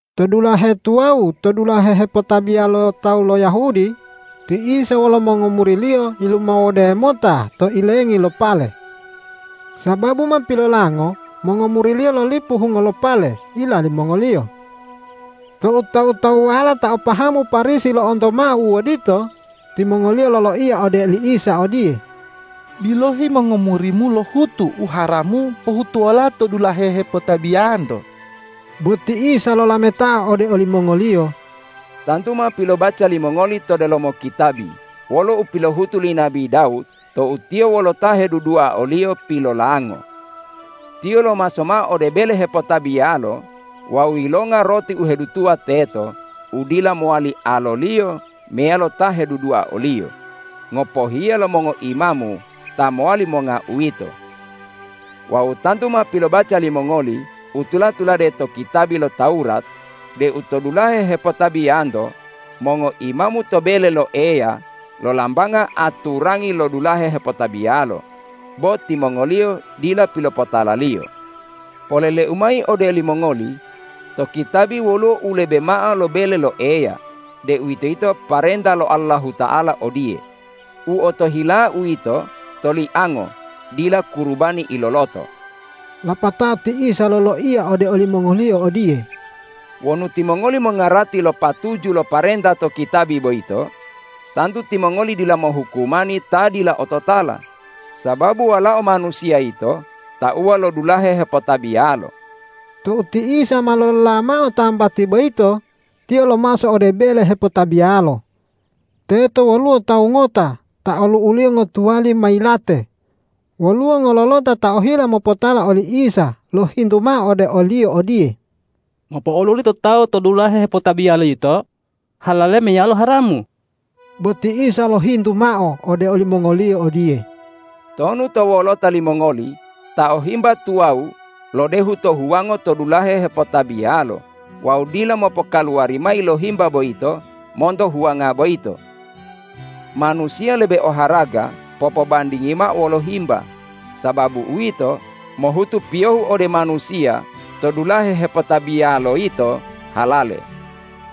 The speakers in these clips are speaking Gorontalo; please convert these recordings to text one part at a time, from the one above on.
To dulahe tuwawu to dulahe hepotabiya lo tawu lo Yahudi, ti Isa wolo mongomuri-Liyo yilumawode mota to ilengi lo pale. Sababu ma pilolango mongomuri-Liyo lolipu hungo lo pale ila limongoliyo. Tou tawu-tawuwala ta o pahamu Parisi lo'onto mao u odito, timongoliyo loloiya ode oli Isa odiye,”Bilohi, mongomuri-Mu lohutu u haramu pohutuwola to dulahe hepotabiyanto.” Bo ti Isa lolametao ode olimongoliyo,”Tantu ma pilobaca limongoli to delomo kitabi wolo u pilohutu li nabi Dawud tou tiyo wolo ta hedudua oliyo pilolango. Tiyo lomaso mao ode bele hepotabiyalo wawu yilonga roti u hedutuwa teto u dila mowali aloliyo meyalo ta hedudua oliyo, ngopohiya lo mongoimamu ta mowali monga uwito. Wawu tantu ma pilobaca limongoli u tula-tulade to kitabi lo Tawurat deu to dulahe hepotabiyanto mongoimamu to bele lo Eya lolambanga aturangi lo dulahe hepotabiyalo, bo timongoliyo dila pilopotalaliyo. Polele-U mayi ode olimongoli: To kitabi woluwo u lebe mao lo bele lo Eya, deuwitoyito parenta lo Allahuta'ala odiye, ’U otohila-U yito toliango dila kurubani iloloto.’” Lapatao ti Isa loloiya ode olimongoliyo odiye,”Wonu timongoli mongarati lo patuju lo parenta to kitabi boyito, tantu timongoli dila mohukumani ta dila ototala. Sababu Walao Manusiya yito tauwa lo dulahe hepotabiyalo.” Tou ti Isa ma lolola mao tambati boyito, Tiyo lomaso ode bele hepotabiyalo. Teto woluwo tawu ngota ta olu'uliyo ngotuwali ma yilate. Woluwo ngololota ta ohila mopotala oli Isa lohintu mao ode o-Liyo odiye,”Mopo'oluli to tawu to dulahe hepotabiyalo yito halale meyalo haramu?” Bo ti Isa lohintu mao ode olimongoliyo odiye,”Tonu to wolota limongoli ta o himba tuwawu lodehu to huwango to dulahe hepotabiyalo wawu dila mopokaluwari mayi lo himba boyito monto huwanga boyito? Manusiya lebe oharaga popobandingiyo mao wolo himba. Sababu uwito, mohutu piyohu ode manusiya to dulahe hepotabiyalo yito halale.”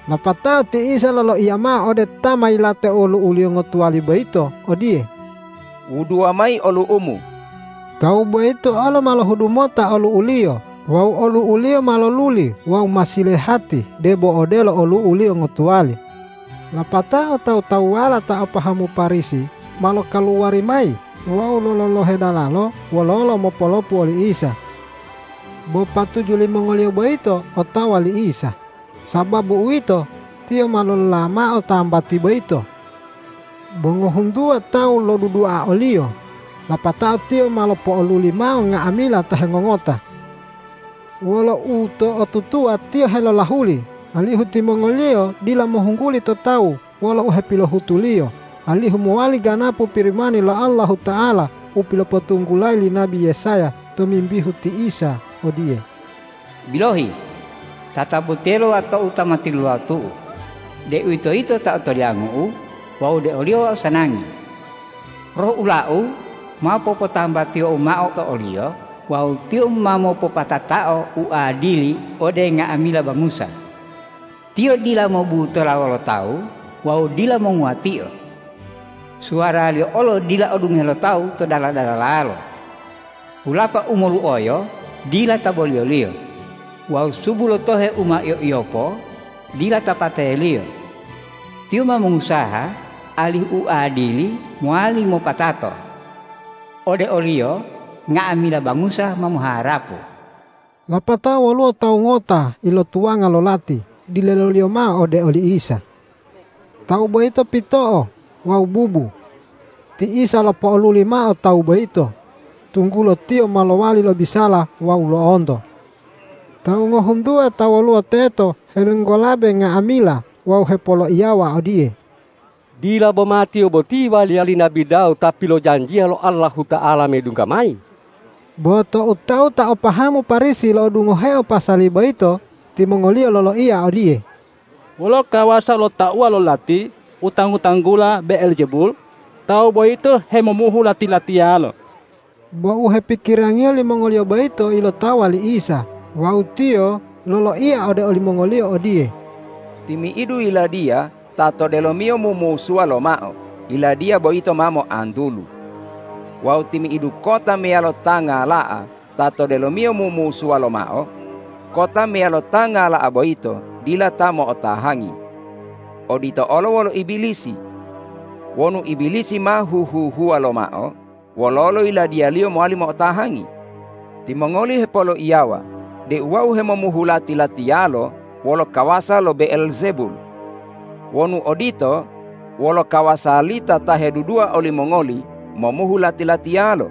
Lapatao ti Isa loloiya mao ode ta ma yilate olu'uliyo ngotuwali boyito odiye,”Wuduwa mayi olu'umu!” Tawu boyito olo ma lohudu mota olu'uliyo wawu olu'uliyo ma loluli wawu ma silehati debo odelo olu'uliyo ngotuwali. Lapatao tawu-tawuwala ta o pahamu Parisi ma lokaluwari mayi wawu lololohe dalalo wololo mopolopu oli Isa. Bo patuju limongoliyo boyito otawa li Isa. Sababu uwito, Tiyo ma lolola mao tambati boyito. Bo ngohuntuwa tawu lodudua o-Liyo, lapatao Tiyo ma lopo'oluli mao nga'amila ta hengongota. Wolo uto'otutuwa Tiyo helolahuli, alihu timongoliyo dila mohungguli to tawu wolo u hepilohutu-Liyo alihu mowali ganapu Pirimani lo Allahuta'ala u pilopotunggulayi li nabi Yesaya tomimbihu ti Isa odiye, ”Bilohi, tatabotiye lo Wato-U ta ma tilulawotu-U, deuwitoyito ta otoliangu-U wawu ode o-Liyo Wau sanangi. Roh ula-U ma popotambatiyo-U mao to o-Liyo wawu Tiyo ma mopopatatao uadili ode nga'amila bangusa. Tiyo dila mobutola wolo tawu wawu dila monguwatio. Suwara-Liyo olo dila odungohe lo tawu to dala-dalalalo. Hulapa u moluoyo dila ta boliyo-Liyo wawu subu lo tohe u ma iyo-iyopo dila ta pate-Liyo. Tiyo ma mongusaha alihu u adili mowali mopatato. Ode o-Liyo nga'amila bangusa ma moharapu.” Lapatao woluwo tawu ngota ilotuwanga lo lati dileloliyo mao ode oli Isa. Tawu boyito pito'o wawu bubu. Ti Isa lopo'oluli mao tawu boyito, tunggulo tiyo ma lowali lobisala wawu lo'onto. Tawu ngohuntuwa ta woluwo teto helinggolabe nga'amila wawu hepoloiyawa odiye,”Dila boma Tiyo boti waliya li nabi Dawud Ta pilojanjiya lo Allahuta'ala medungga mayi?” Bo tou tawu ta o pahamu Parisi lo'odungoheo pasali boyito, timongoliyo loloiya odiye,”Wolo kawasa lo tauwa lo lati u tanggu-tanggula Be'eljebul, tawu boyito hemomuhu lati-latiyalo.” Bo u hepikirangiyo limongoliyo boyito ilotawa li Isa wawu Tiyo loloiya ode olimongoliyo odiye,”Timi'idu yiladiya ta to delomiyo mumusuwa lomao, yiladiya boyito ma moantulu. Wawu timi'idu kota meyalo ta ngala'a ta to delomiyo mumusuwa lomao kota meyalo ta ngala'a boyito dila ta mo'otahangi. Odito olo wolo Ibilisi. Wonu Ibilisi ma huhu-huwa lomao, wololo yiladiyaliyo mowali mo'otahangi? Timongoli hepoloiyawa deu Wau hemomuhu lati-latiyalo wolo kawasa lo Be'eljebul. Wonu odito, wolo kawasa lita ta hedudua olimongoli momuhu lati-latiyalo?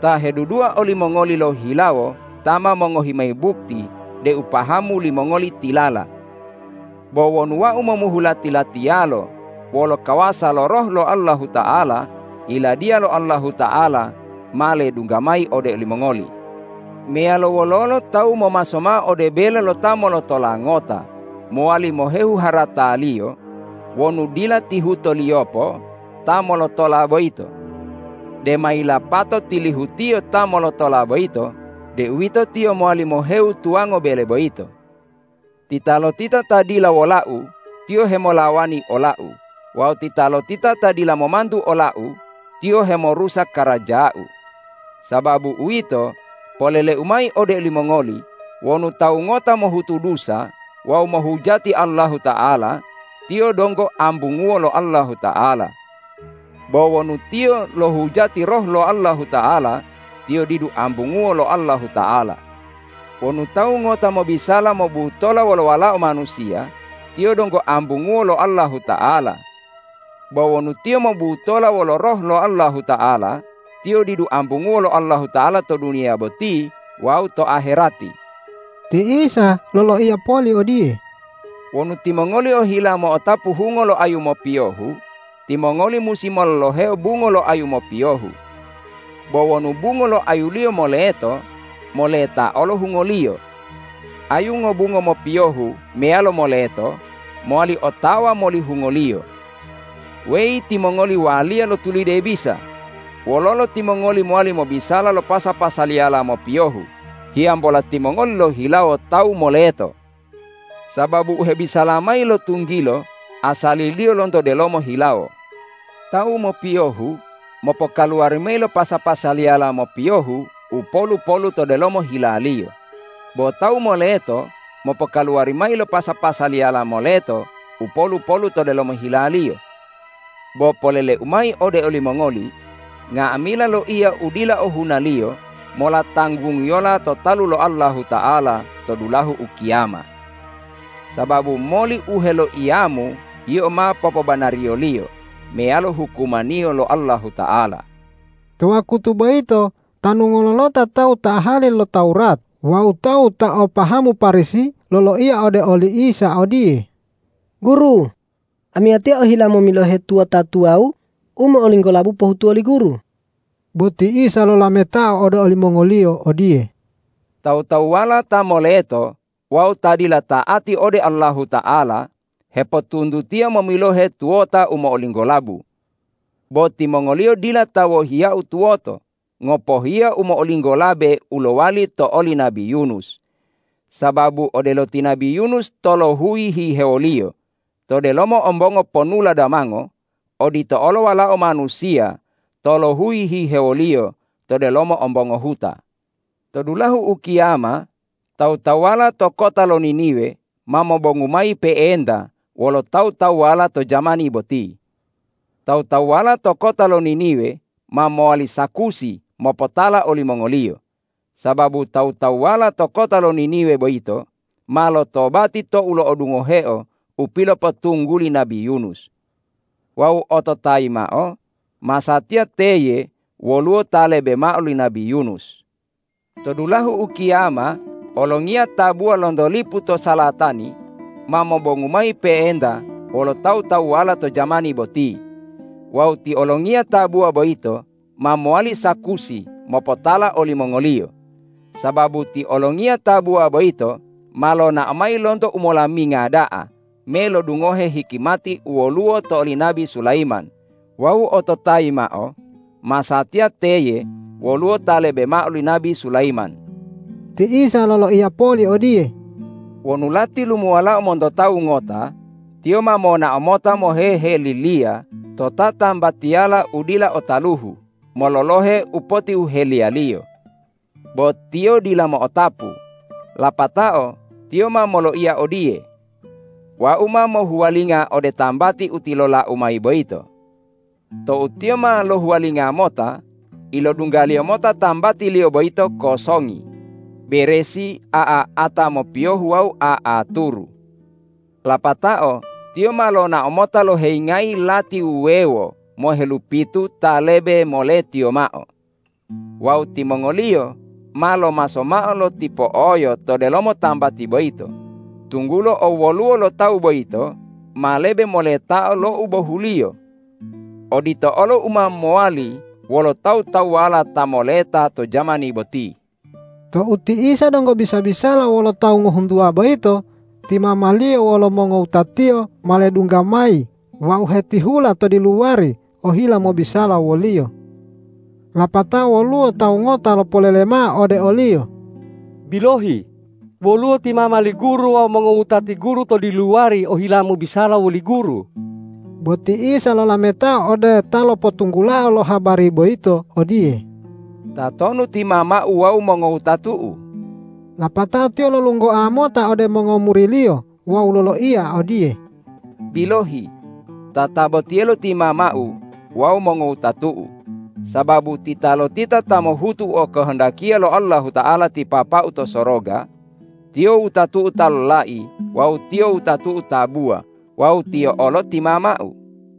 Ta hedudua olimongoli lohihilawo ta ma mongohi mayi bukti deu pahamu limongoli tilala. Bo wonu Wau momuhu lati-latiyalo wolo kawasa lo Roh lo Allahuta'ala, Yiladiya lo Allahuta'ala ma ledungga mayi ode olimongoli. Meyalo wololo tawu momaso mao ode bele lo ta molotola ngota mowali mohehu harataliyo wonu dila tihutoliyopo ta molotola boyito. Dema yilapato tilihutiyo ta molotola boyito deuwito tiyo mowali mohewu tuwango bele boyito. Titalotita ta dila wola-U, tiyo hemolawani ola-U; wawu titalotita ta dila momantu ola-U, tiyo hemorusa karaja-U. Sababu uwito, polele-U mayi ode olimongoli: Wonu tawu ngota mohutu dusa wawu mohujati Allahuta'ala, tiyo donggo ambunguwo lo Allahuta'ala. Bo wonu tiyo lohujati Roh lo Allahuta'ala, tiyo didu ambunguwo lo Allahuta'ala. Wonu tawu ngota mobisala mobutola wolo Walao Manusiya, tiyo donggo ambunguwo lo Allahuta'ala. Bo wonu tiyo mobutola wolo Roh lo Allahuta'ala, tiyo didu ambunguwo lo Allahuta'ala to duniya boti wawu to aherati.” Ti Isa loloiya poli odiye,”Wonu timongoli ohila mo'otapu hungo lo ayu mopiyohu, timongoli musi mololoheo bungo lo ayu mopiyohu. Bo wonu bungo lo ayuliyo moleto, moleta olo hungoliyo. Ayu ngobungo mopiyohu meyalo moleto mowali otawa moli hungoliyo. Weyi timongoli waliya lo tulide bisa, wololo timongoli mowali mobisala lo pasa-pasaliyala mopiyohu hiyambola timongoli lohihilawo tawu moleto? Sababu u hebisala mayi lo tunggilo asaliliyo lonto delomo hilawo. Tawu mopiyohu mopokaluwari mayi lo pasa-pasaliyala mopiyohu u polu-polu to delomo hilaliyo, bo tawu moleto mopokaluwari mayi lo pasa-pasaliyala moleto u polu-polu to delomo hilaliyo. Bo polele-U mayi ode olimongoli: Nga'amila loiya u dila ohunaliyo mola tanggungiyola to talu lo Allahuta'ala to dulahu ukiyama. Sababu moli u heloiyamu yio ma popobanariyo-Liyo meyalo hukumaniyo lo Allahuta'ala.” To wakutu boyito tanu ngololota tawu ta ahali lo Tawurat wawu tawu ta o pahamu Parisi loloiya ode oli Isa odiye,”Guru, amiyatiya ohila momilohe tuwota tuwawu u mo'olinggolabu pohutuwo li Guru.” Bo ti Isa lolametao ode olimongoliyo odiye,”Tawu-tawuwala ta moleto wawu ta dila ta'ati ode Allahuta'ala hepotuntutiya momilohe tuwota u mo'olinggolabu. Bo timongoliyo dila ta wohiya-U tuwoto, ngopohiya u mo'olinggolabe u lowali to oli nabi Yunus. Sababu odelo ti nabi Yunus tolohuyi hihewoliyo to delomo ombongo ponula damango, odito olo Walao Manusiya tolohuyi hihewoliyo to delomo ombongo huta. To dulahu ukiyama tawu-tawuwala to kota lo Niniwe ma mobongu mayi pe'enta wolo tawu-tawuwala to jamani boti. Tawu- tawuwala to kota lo Niniwe ma mowali sakusi mopotala olimongoliyo, sababu tawu-tawuwala to kota lo Niniwe boyito ma lotobati tou lo'odungoheo u pilopotungguli nabi Yunus. Wawu ototayi mao: Masatiya teye woluwo Ta lebe mao li nabi Yunus! To dulahu ukiyama olongiya tabuwa lonto lipu to salatani, ma mobongu mayi pe'enta wolo tawu-tawuwala to jamani boti. Wawu ti olongiya tabuwa boyito ma mowali sakusi mopotala olimongoliyo, sababu ti olongiya tabuwa boyito ma lonao mayi lonto umolaminga da'a me lodungohe hikimati u woluwo to oli nabi Sulayiman wawu ototayi mao: Masatiya teye woluwo Ta lebe mao li nabi Sulayiman!” Ti Isa loloiya poli odiye,”Wonu lati lumuwalao monto tawu ngota, tiyo ma monao mota moheheliliya to tatambatiyala u dila o taluhu mololohe u potihuheliyaliyo. Bo tiyo dila mo'otapu. Lapatao tiyo ma moloiya odiye, ’Wau ma mohuwalinga ode tambati u tilolau mayi boyito.’ Tou tiyo ma lohuwalinga mota, ilodunggaliyo mota tambatiliyo boyito kosongi, beresi, a'a-a'ata mopiyohu wawu a'aturu. Lapatao tiyo ma lonao mota loheyingayi lati wuwewo mohelupitu ta lebe moletiyo mao. Wawu timongoliyo ma lomaso mao lotipo'oyo to delomo tambati boyito, tunggulo owwoluwo lo tawu boyito ma lebe moletao lo u bohuliyo. Odito olo u ma mowali wolo tawu-tawuwala ta moleta to jamani boti.” Tou ti Isa donggo bisa-bisala wolo tawu ngohuntuwa boyito, ti mama-Liyo wolo mongowuta-Tiyo ma ledungga mayi wawu hetihula to diluwari ohila mobisala wo-Liyo. Lapatao woluwo tawu ngota lopolele mao ode o-Liyo,”Bilohi, woluwo ti mama li Guru wawu mongowutati Guru to diluwari ohila mobisala woli Guru.” Bo ti Isa lolametao ode ta lopotunggulao lo habari boyito odiye,”Tatonu ti mama-U wawu mongowutatu-U?” Lapatao Tiyo lolunggoa mota ode mongomuri-Liyo wawu loloiya odiye,”Bilohi, tatabotiyelo ti mama-U wawu mongowutatu-U. Sababu titalotita ta mohutu u okohondakiya lo Allahuta'ala ti Papa-U to soroga, tiyo wutatu-U ta lolai wawu tiyo wutatu-U tabuwa wawu tiyo olo ti mama-U.”